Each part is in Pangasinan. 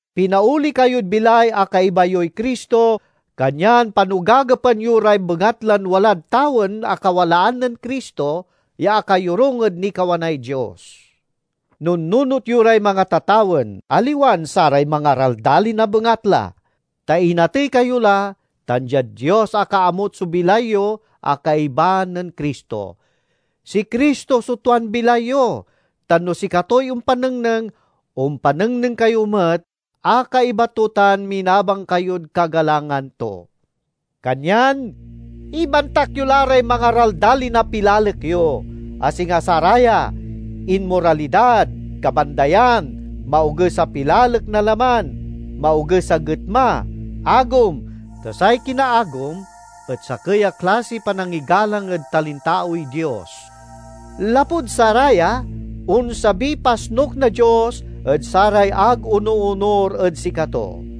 Pinaoli kayod bilay a kaiba yoy Cristo, kanyan panogagepan yo ray bengatlan walad tawen a kawalaan nen Cristo, ya akayorung ed nikawanay Dios. Nunnunot yo ray mangatatawen, aliwan saray mangaraldalin a bengatla. Ta inatey kayo la, tan diad Dios akaamut so bilay yo a kaiba nen Cristo. Si Cristo so tuan bilay yo, tan no sikatoy ompanengneng, ompanengneng kayo met a kaiba to tan minabang kayod kagalangan to! Kanyan ibantak yo la ray mangaraldalin a pilalek yo, a singa saraya: inmoralidad, kabandayan, maoges a pilalek na laman, maoges a getma, agom (ta say kinaagom et sakey a klasiy panangigalang ed talintaoy dios). Lapud saraya, onsabiy pasnuk na Dios ed saray ag onoonur ed sikato.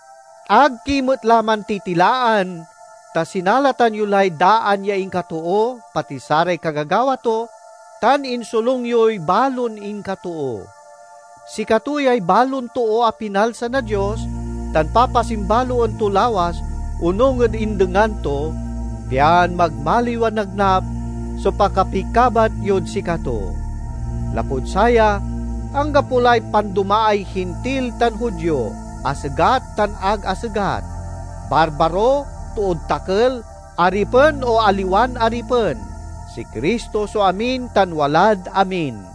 Ag ki met la mantitilaan, ta sinalatan yo lay daan ya inkatoo, pati saray kagagawa to, tan insolung yoy balon inkatoo. Sikato yay balon too a pinalsa na Dios tan papasimbaloen to lawas onung ed indengan to, pian magmaliw a nagnap so pakapikabat yod sikato. Lapud saya anggapo lay pandomaay Hintil tan Judio, asegat tan ag asegat, barbaro, tood takel, aripen o aliwan aripen; si Cristo so amin tan walad amin.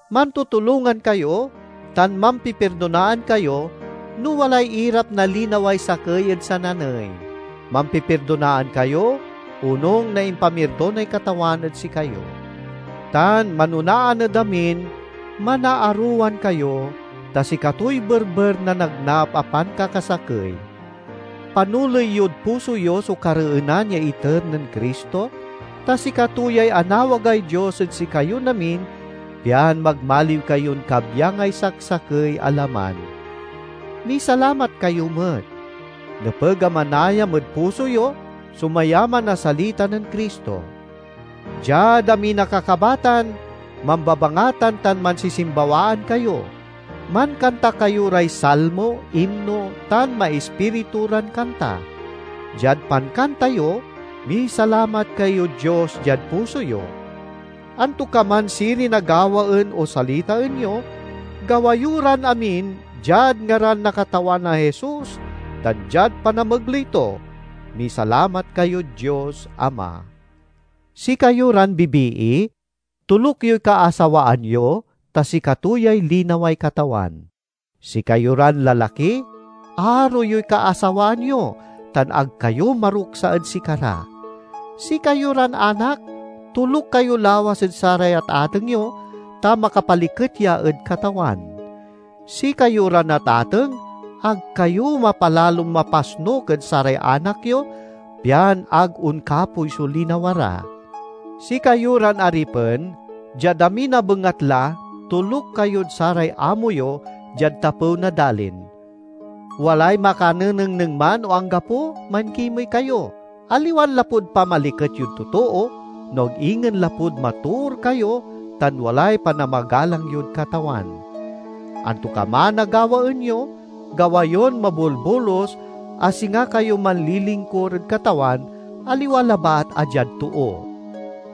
Mantutulongan kayo, tan mampipirdonaan kayo no walay irap na linaway sakey ed sananey. Mampipirdonaan kayo, onung na impamirdonay Katawan ed sikayo. Tan manonaan ed amin, manaarowan kayo, ta sikatoy berber na nagnap a pankakasakey. Panoley yod puso yo so kareenan ya iter nen Cristo, ta sikato yay anawagay Dios ed sikayon amin pian magmaliw kayon kabyangay saksakey a laman. Misalamat kayo met. Nepeg a manayam ed puso yo so mayaman a salita nen Cristo. Diad amin a kakabatan mambabangatan tan mansisimbawaan kayo. Mankanta kayo ray salmo, imno, tan maispiritu ran kanta. Diad pankanta yo, misalamat kayod Dios diad puso yo. Antokaman sirin a gawaen o salitaen yo, gawa yo ran amin diad ngaran na Katawan a Jesus, tan diad panamegley to, misalamat kayod Dios Ama. Sikayo ran bibii, toluk yoy kaasawaan yo, ta sikato yay linaway Katawan. Sikayo ran lalaki, aro yoy kaasawaan yo, tan ag kayo maruksa ed sikara. Sikayo ran anak, toluk kayo lawas ed saray atateng yo, ta makapaliket ya ed Katawan. Sikayo ran atateng, ag kayo mapalalon mapasnuk ed saray anak yo, pian ag onkapoy so linawa ra. Sikayo ran aripen, diad amin a bengatla toluk kayod saray amo yo diad tapew na dalin. Walay makanenengneng man o anggapo mankimey kayo, aliwan lapud pamaliket yod totoo, no ag ingen lapud matoor kayo tan walay panamagalang yod Katawan. Antokaman a gawaen yo, gawa yon mabolbolus, a singa kayo manlilingkur ed Katawan, aliwa labat a diad too.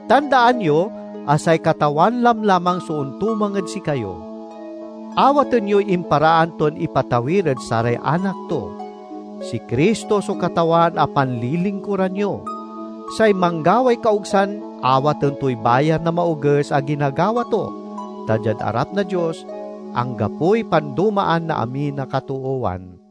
Tandaan yo a say Katawan lamlamang so ontumang ed sikayo; awaten yoy imparaan ton ipatawir ed saray anak to. Si Cristo so Katawan a panlilingkuran yo. Say manggaway kaogsan awaten toy bayar na maoges a ginagawa to; ta diad arap na Dios, anggapoy pandomaan na amin a katoowan.